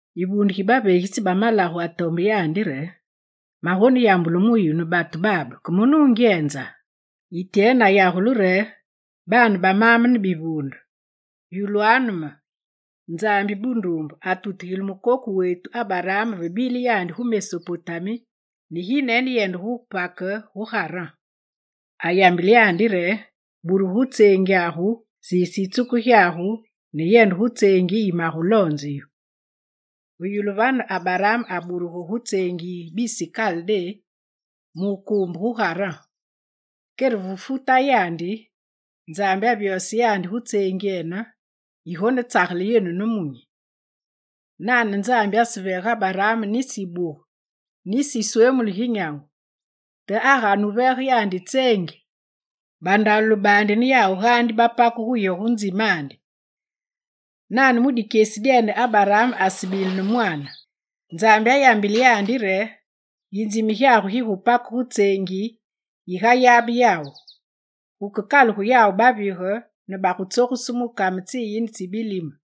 Yivuunde gi baveegitsi ba malagu atombe yandi re: «Magoneyambulu mu yu ne batu babe ke ma nungyenza?» Ityene ayagule re: «Baane ba maame ne bivuunde, yulwanu me. Nzambi bunduumbe atutugile mukoku wetu Abaraam ve bile yandi gu Mesopotami ne gineyende gu wupake gu Garan. Ayambile yandi re: “Burugu gu tseengyagu, siise yitsuku gyagu ne yende gu tseengi yi maguloonge yu.” Ve yulu vane Abaraam aburugu gu tseengi yi bisi Kaldé mu wukuumbe gu Garan. Kere ve fu tayandi, Nzambi avyose yandi gu tseengyene yigonetsagele yenu nemunyi. Nane Nzambi aseveege Abaraam nisi yibuge nisi ma yiswemulu gi nyangu; te agane wuveege yandi tseengi, bandalule baandi ne yawu gaandi bagupake gu yo gu nzimandi. Nane mu dikyesi dyene, Abaraam asebile ne mwaane. Nzambi ayambile yandi re: “Yinzime gyagu gigupake gu tseengi yi gayabe yawu, gukekalugu yawu bavige ne bagutsogusu mu kame tsiyine tsi bilime.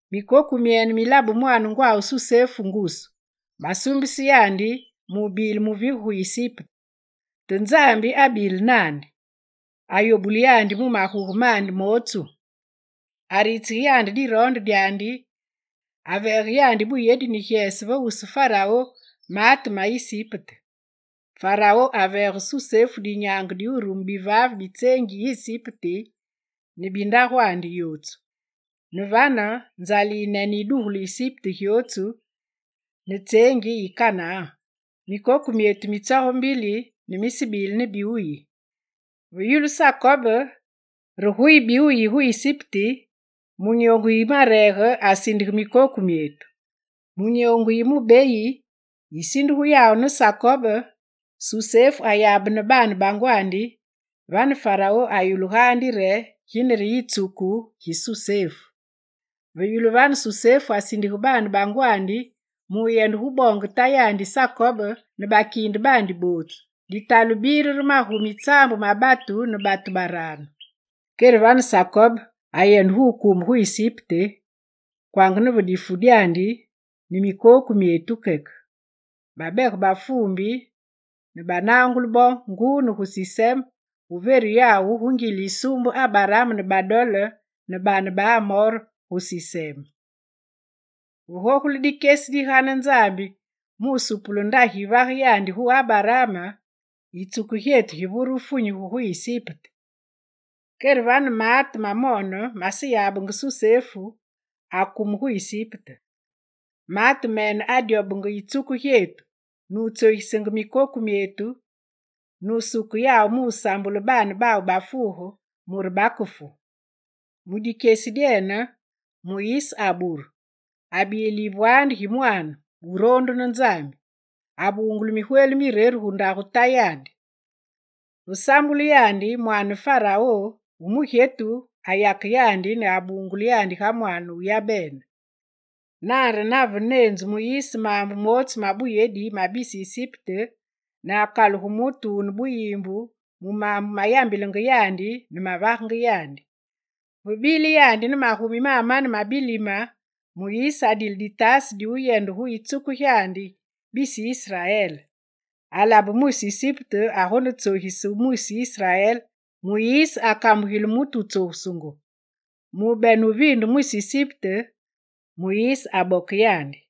Mikoku myene milabe mwaane ngwawu Susefu ngusu. Basuumbise yandi mu bile muvige gu Isipte. Te Nzambi abile naandi. Ayobule yandi mu maguge mandi mootsu. Aritsige yandi diroonde dyandi aveege yandi buyedi ne gyese va wusu Farao, maate me Isipte. Farao aveege Susefu dinyaange di wurume bivaave bi tseengi yi Isipte ne bi ndagwandi yootsu. Ne vane, nzale yinene yidugulu Isipte gyootsu ne tseengi yi Kanaan. Mikoku myetu mitsoge mbili ne misebedile bi wuyi. Ve yulu Sakob re guyi bi wuyi gu Isipte, mu nyoongu yimareege asindige mikoku myetu. Mu nyoongu yi mubeyi yisindugu yawu ne Sakob, Susefu ayabene ne baane ba ngwandi, vane Farao ayulu gaandi re gine re yitsuku gi Susefu. Ve yulu vane, Susefu asindige baane bangwandi muyende guboonge tayandi Sakob ne bakiinde baandi bootsu, ditalu bile re magumi tsaambu ne batu baraanu. Kere vane Sakob ayende gu wukuumbe gu Isipte kwanga ne ve difu dyandi, ne mikoku myetu keke. Babege bafuumbi ne banangule bo nguu ne gu Sisem gu veru yawu gu ngile yisuumbe Abaraam ne badole ne baane ba Amor, gu Sisem. Ve gogule dikyesi digane Nzambi mu wusupule ndagi yivage yandi gu Abaraam, yitsuku gyetu givure wufunyugu gu Isipte. Kere vane maate mamoone maseyabe Susefu, akumenge gu Isipte. Maate mene adyobenge yitsuku gyetu, nutsogisenge mikoku myetu, nusuke yawu musambule baane bawu bafuuge mure bakefu. Mu dikyesi dyene Muyise aburu, abile yivwaandi gi mwaane, wuroondu ne Nzambi. Abungulu migweli mireru gugare ndagu tayandi. Ve sambulu yandi, mwaane Farao wu mugyetu ayake yandi ne abungule yandi ga mwaane wu yabene Nane re nave neenzu Muyise maambu mootsu mabuyedi ma bisi Isipte ne akalugu mutu wune buyiimbu mu maambu mayambilenge yandi ne mavagenge yandi. Ve bile yandi ne magumi mamane ma bilime, Muyise adile ditaase di wuyende gu yitsuku gyandi, bisi Israel. Alabe mwisi Isipte agonetsogise mwisi Israel; Muyise akambugile mutu wutsogusungu. Mu bene wuviinde mwisi Isipte, aboke yandi.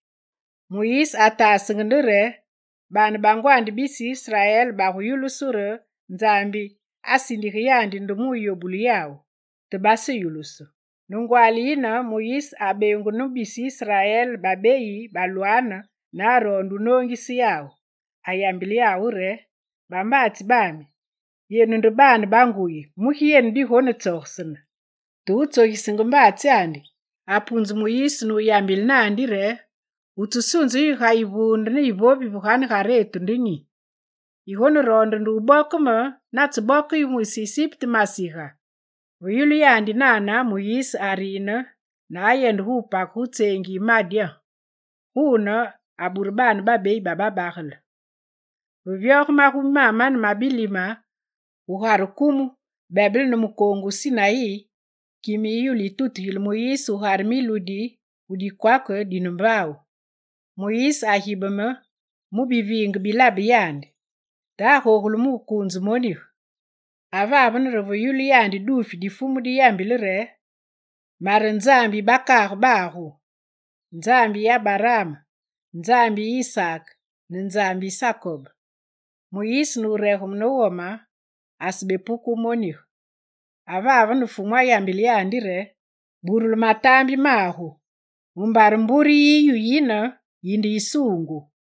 Muyise ataasenge nde re, baane ba ngwandi bisi Israel baguyulusu re Nzambi asindige yandi nde muyobule yawu. Te baseyulusu. Ne ngwaali yine, Muyise abeengunu ne bisi Israel babeyi balwaane ne aroonde wunoongise yawu. Ayambile yawu re: “Bambaatsi bami, yenu nde baane ba nguyi; mugi yenu digonetsogesene?” Te wutsogisenge mbaatsyandi apunze Muyise nuyambile naandi re: “Wutsesunze yu ga yivuunde ne yivovi ve ganegaretu nde nyi? Yigoneroonde nde wuboke me natseboke yu mwisi Isipte masiga?” Ve yulu yandi nane, Muyise ariine ne ayende gupake gu tseengi yi Madyan. Guune, abure baane babeyi ba babagele. Ve vyoge magumi mamane ma bilime, gugare kumu bebele ne mukoongu wu Sinayi kime yiyulu yitutugile Muyise gugare miludi gu dikwake dine mbaawu. Muyise agibeme mu biviinge bilabe yandi. Te agogule mukuunze monige. Avane re ve yulu yandi duufi di Fumu di yambile re: “Mare Nzambi yi bakaage bagu, Nzambi yi Abaraam, Nzambi yi Isaak ne Nzambi yi Sakob.” Muyise nuregeme ne wome, asebepuke wumonige. Avane Fumu ayambile yandi re: “Burule mataambi magu mumbare mbure yiyu yine yinde yisuungu.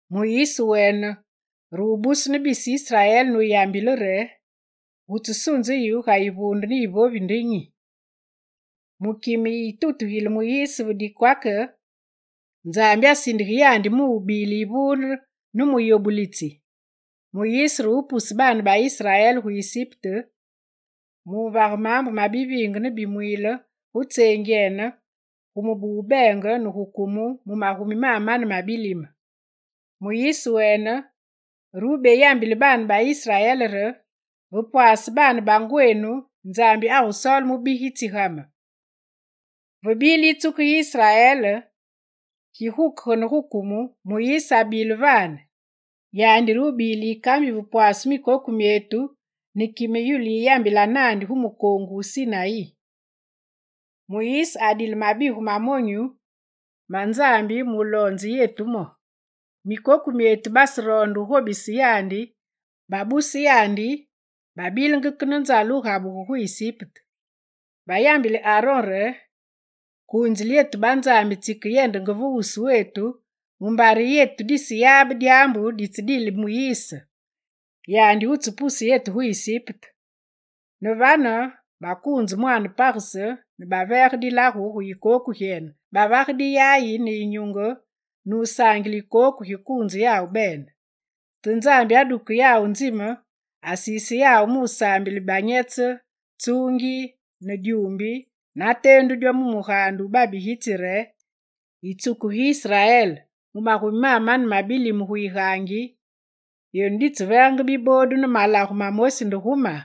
Muyise wene re wubusu ne bisi Israel nuyambile yandi re: “Wutsesunze yu ga yivuunde ne yivovi nde nyi?” Mu kime yi tutugile Muyise ve dikwake, Nzambi asindige yandi mubile yivuunde ne muyobulitsi. Muyise re wupuse baane ba Israel gu Isipte mu wuvage maambu mabiviinge ne bimwiile gu tseengyene, gu mubu wu beenge ne gu kumu mu magumi mamane ma bilime. Muyise wene re wubeyambile baane ba Israel re: “Ve pwaase baane bangwenu, Nzambi agusoole mubigitsi ga me.” Ve bile yitsuku gi Israel gigukegane gu kumu, Muyise abile vane, yandi re wubile yikambi ve pwaase mikoku myetu ne kime yulu yiyambila naandi gu mukoongu wu Sinayi. Muyise adile mabigu ma monyu ma Nzambi muloonze yetu mo. Mikoku myetu baseroonde wugobise yandi; babuse yandi babilenge ke ne nzale wugabugu gu Isipte. Bayambile Aron re: “Kuunzile yetu banzambi tsikeyendenge ve wuswetu mumbare yetu diseyabe dyaambu ditsedile Muyise, yandi wutsepuse yetu gu Isipte.” Ne vane, bakuunze mwaane pagese ne baveege dilagu gu yikooku gyene, bavage diyayi ne yinyunge nusaangile yikooku gikuunze yawu bene. Te Nzambi aduke yawu nzime, asiise yawu musaambile banyetse, tsuungi, ne dyuumbi nateendu dyo gu mugaande wu babigitsi re: “Yitsuku gi Israel, mu magumi mamane ma bilime gu yigaangi, yenu ditseveegenge biboodu ne malagu mamosi nde gu ma?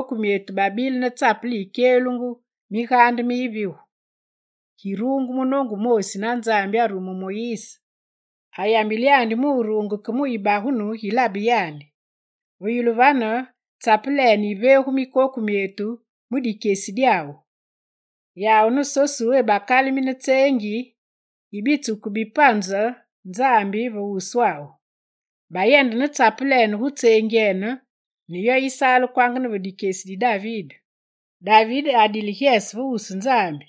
Gu kumu, mikoku myetu babile ne tsapele yikyelungu migaande mi yivigu. Giruungu munoongu wumoosi na Nzambi arume Muyise. Ayambile yandi mu wuruunge ke mu yibagunu gilabe yandi. Ve yulu vane, tsapelene yiveegu mikoku myetu mu dikyesi dyawu. Yawu ne Sosuwé bakalimine tseengi yi bitsuku bipunze Nzambi ve wuswawu. Bayende ne tsapelene gu tseengyene, ne yo yisaale kwanga ne ve dikyesi di David. David adile gyese va wusu Nzambi,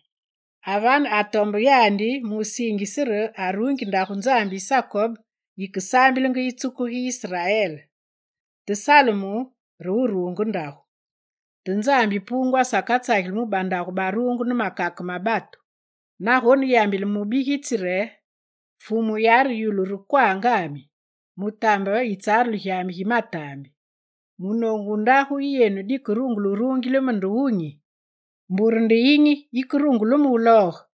avane atombe yandi musiingise re aruungi ndagu Nzambi yi Sakob yikesaambilenge yitsuku gi Israel. Te Salumu re wuruunge ndagu. Te Nzambi Puungu asakatsageli mu bandagu baruungu ne makake ma batu. Nagone yambile mubigitsi re: “Fumu yare, yulu re kwangami, Mutambe yitsarulu gyami gi mataambi. Munoongu wu ndagu yi yenu dikerungule wuruungile me nde wunyi? Mbure nde yinyi yikerungule me wulooge?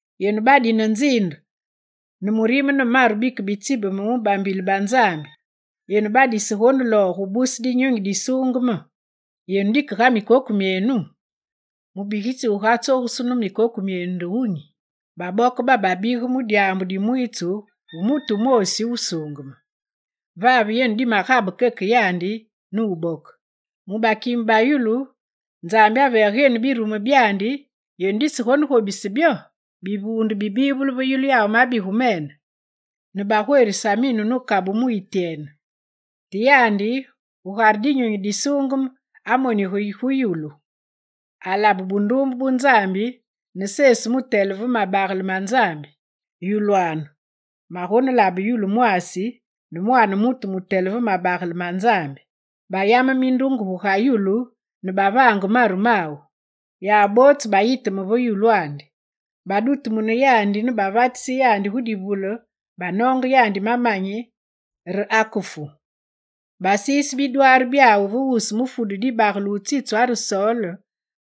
Yenu badine nziinde, ne murime ne maru bikebitsibeme mu bambile ba Nzambi, yenu badisegonelooge wubuse Dinyunyi Disuungeme! Yenu dike ga mikoku myenu! Mubigitsi wugatsogusu ne mikoku myenu de wunyi? Baboke bababige mu dyaambu dimwiitsu wu mutu wumoosi Wusuungeme; vave yenu dimegabe keke yandi, nuboke. Mu bakime ba yulu, Nzambi aveege yenu birumu byandi, yenu disegobise byo!» Bivuunde bibivulu ve yulu yawu mabigu mene ne bagwerisa minu ne kabu mu Ityene. Te yandi, gugare Dinyunyi Disuungeme, amoniga gu yulu; alabe bunduumbe bu Nzambi ne Sesu mutele ve mabagele ma Nzambi. Ayambile re: «Yulwanu, magonelabe yulu mwaasi ne Mwaane mutu mutele ve mabagele ma Nzambi.» Bayame mindunge gu ga yulu ne bavange maru mawu. Yawu bootsu bayiteme ve yulwandi, badutumune yandi ne bavatise yandi gu divule banoonge yandi mamanyi re akefu. Basiise bidwaari byawu ve wusu mufudu dibagele wutsitswa re Sol,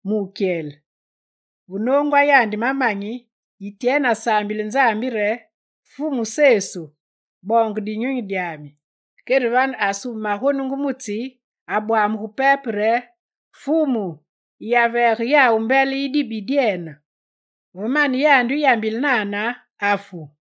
mu wukyele. Ve noongwa yandi mamanyi, Ityene asambile re: «Fumu Sesu, boonge dinyunyi dyami.» Kere vane asume magonungu mu tsi, abwamugu pepe re: «Fumu, yiyaveege yawu mbele yi dibi dyene!» Ve mane yandi wuyambile nane, afu.